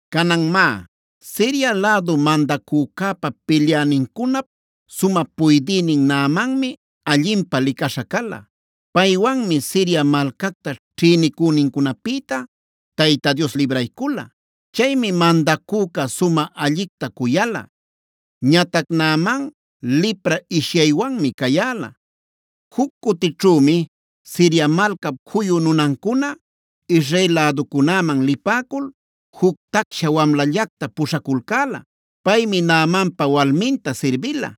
Canan má, Siria lädu mandacücäpa pilyänincunap sumä puydïnin Naamanmia allinpä licaśha cala. Paywanmi Siria malcacta ćhïnicünincunapïta Tayta Dios libraycula. Chaymi mandacüca sumä allicta cuyala. Ñatac Naaman lipra ishyaywanmi cayäla. Juc cutićhümi Siria malcap juyu nunancuna Israel läducunäman lipäcul juc tacsha wamlallacta puśhaculcäla. Paymi Naamanpa walminta sirbila.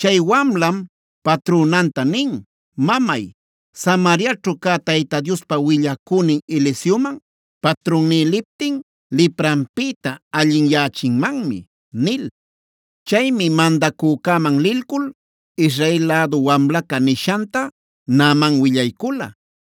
Chay wamlam patrünanta nin: “Mamay, Samariaćhu cä Tayta Diospa willacünin Eliseoman patrunní liptin lipranpïta allinyächinmanmi” nil. Chaymi mandacücäman lilcul Israel lädu wamlaca nishanta Naaman willaycula.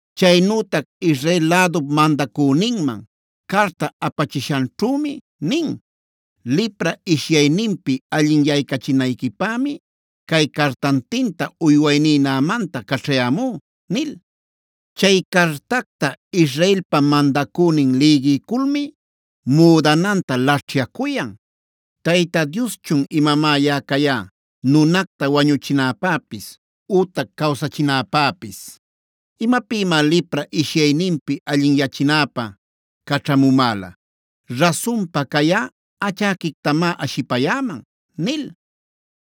Chaynütac Israel lädup mandacüninman carta apachishanćhümi nin: “Lipra ishyayninpi allinyaycachinayquipämi cay cartantinta uywayní Naamanta caćhayämú” nil. Chay cartacta Israelpa mandacünin lïgiyculmi müdananta laćhyacuyan: “¿¡Tayta Dioschun imamá yaꞌa cayá nunacta wañuchinäpäpis ütac cawsachinäpäpis!? ¿Imapïmá lipra ishyayninpi allinyachinäpä caćhamumäla? Rasunpa, cayꞌa achäquictamá ashipayäman” nil.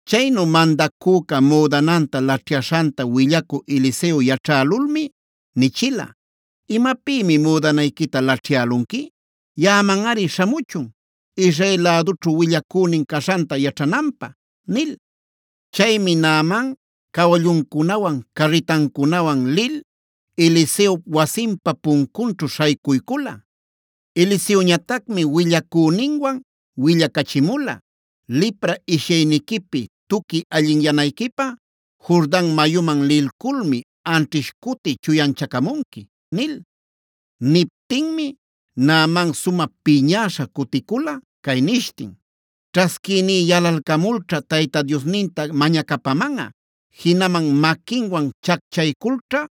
Chaynu mandacüca müdananta laćhyaśhanta willacü Eliseo yaćhälulmi nichila: “¿Imapïmi müdanayquita laćhyälunqui? Yaꞌamanꞌari śhamuchun Israel lädućhu willacünin caśhanta yaćhananpä” nil. Chaymi Naaman cawalluncunawan, carritancunawan lil Eliseop wasinpa puncunćhu śhaycuycula. Eliseoñatacmi willacüninwan willacachimula: “Lipra ishyayniquipi tuqui allinyanayquipä Jordan mayuman lilculmi anćhish cuti chuyanchacamunqui” nil. Niptinmi Naaman sumä piñäśha cuticula cay nishtin: “Ćhasquïní yalalcamulćha Tayta Diosninta mañacapamanꞌa. Jinaman ‘maquinwan chacchayculćhá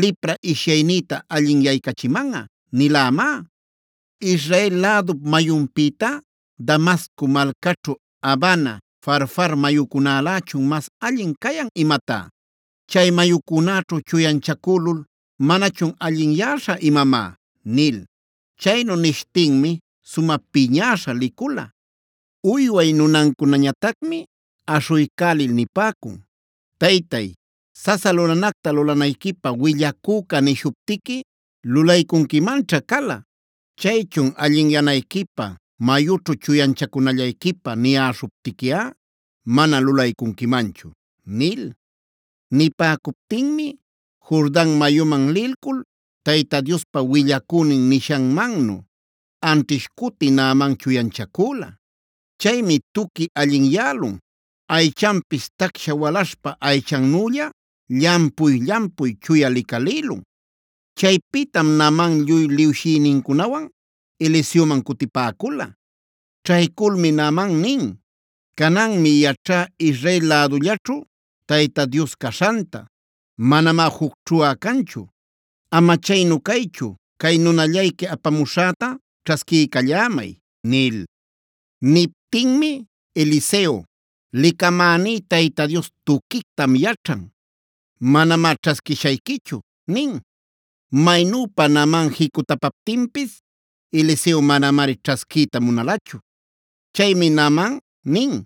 lipra ishyaynïta allinyaycachimanꞌa’ nilämá. ¿Israel lädup mayunpïtá Damasco malcaćhu Abana, Farfar mayucunälächun mas allin cayan imatá? ¿Chay mayucunäćhu chuyanchacülul manachun allinyäśha imamá?” nil. Chaynu nishtinmi sumä piñäśha licula. Uyway nunancunañatacmi aśhuycälil nipäcun: “Taytay, sasa lulanacta lulanayquipä willacüca nishuptiqui lulaycunquimanćha cala. Chaychun allinyanayquipä mayućhu chuyanchacunallayquipä niyäśhuptiquiꞌa mana lulaycunquimanchu” nil. Nipäcuptinmi Jordan mayuman lilcul Tayta Diospa willacünin nishanmannu anćhish cuti Naaman chuyanchacüla. Chaymi tuqui allinyälun, aychanpis tacsha walaśhpa aychannülla llampuy-llampuy chuya licalïlun. Chaypïtam Naaman lluy liwshïnincunawan Eliseoman cutipäcula. Ćhayculmi Naaman nin: “Cananmi yaćhá Israel lädullaćhu Tayta Dios caśhanta; manamá jucćhuꞌa canchu. Ama chaynu caychu, cay nunallayqui apamuśhäta ćhasquiycallämay” nil. Niptinmi Eliseo: “Licamäní Tayta Dios tuquictam yaćhan; manamá ćhasquishayquichu” nin. Maynüpa Naaman jicutapaptinpis Eliseo manamari ćhasquiyta munalachu. Chaymi Naaman nin: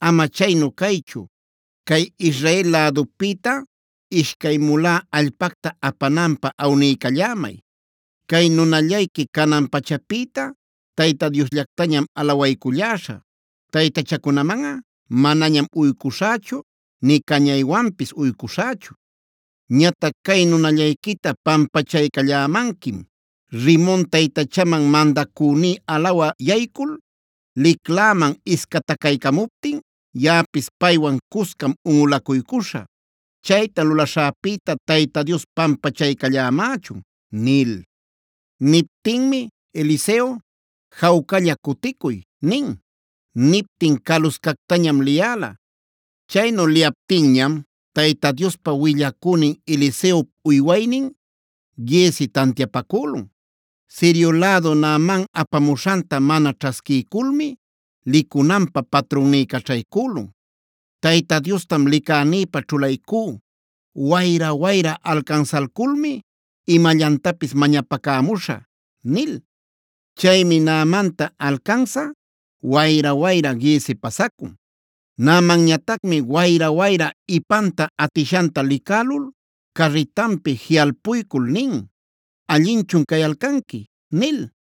“Ama chaynu caychu, cay Israel lädupïta ishcay mulá allpacta apananpä awniycallämay. Cay nunallayqui canan pachapïta Tayta Diosllactañam alawayculläśhä. Taytachacunamanꞌa manañam uycuśhächu nï cañaywanpis uycuśhächu. Ñatac cay nunallayquita pampachaycallämanquim: Rimon taytachaman mandacüní alawä yaycul licläman iscatacaycamuptin yaꞌapis paywan cuscam unꞌulacuycuśhä. Chayta lulaśhäpïta Tayta Dios pampachaycallämächun” nil. Niptinmi Eliseo: “Jawcalla cuticuy” nin. Niptin caluscactañam liyäla. Chaynu liyaptinñam Tayta Diospa willacünin Eliseop uywaynin Giezi tantiapacülun: “Sirio lädu Naaman apamuśhanta mana ćhasquiyculmi, licunanpä patrunní caćhaycülun. Tayta Diostam licänïpä ćhulaycú. Wayra-wayra alcansalculmi imallantapis mañapacämuśhä” nil. Chaymi Naamanta alcansä wayra-wayra Giezi pasacun. Naamanñatacmi wayra-wayra ipanta atishanta licälul carritanpi jiꞌalpuycul nin: “¿Allinchun cayalcanqui?” nil.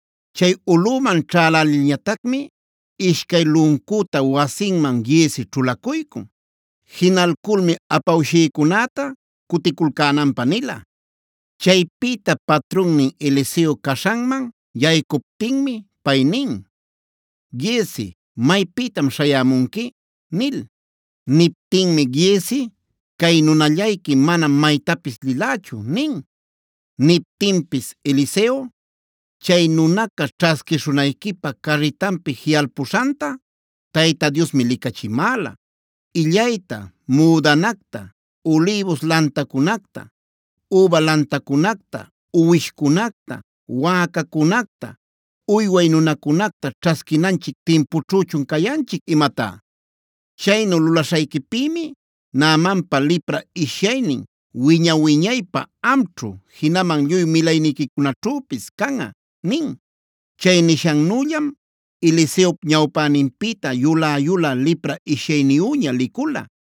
Chay ulꞌuman ćhälälilñatacmi ishcay luncüta wasinman Giezi ćhulacuycun. Jinalculmi apawshïcunäta cuticulcänanpä nila. Chaypïta patrunnin Eliseo caśhanman yaycuptinmi pay nin: “Giezi, ¿maypïtam śhayämunqui?” nil. Niptinmi Giezi: “Cay nunallayqui manam maytapis lilächu” nin. Niptinpis Eliseo: “Chay nunaca ćhasquishunayquipä carritanpi jiꞌalpuśhanta Tayta Diosmi licachimäla. ¿¡Illayta, müdanacta, ulïbus lantacunacta, üba lantacunacta, uwishcunacta, wäcacunacta, uyway nunacunacta ćhasquinanchic timpućhüchun cayanchic imatá!? Chaynu lulaśhayquipïmi Naamanpa lipra ishyaynin wiña-wiñaypä amćhu, jinaman lluy milayniquićhüpis canꞌa” nin. Chay nishannüllam Eliseop ñawpäninpïta yulä-yulä lipra ishyayniyüña licula.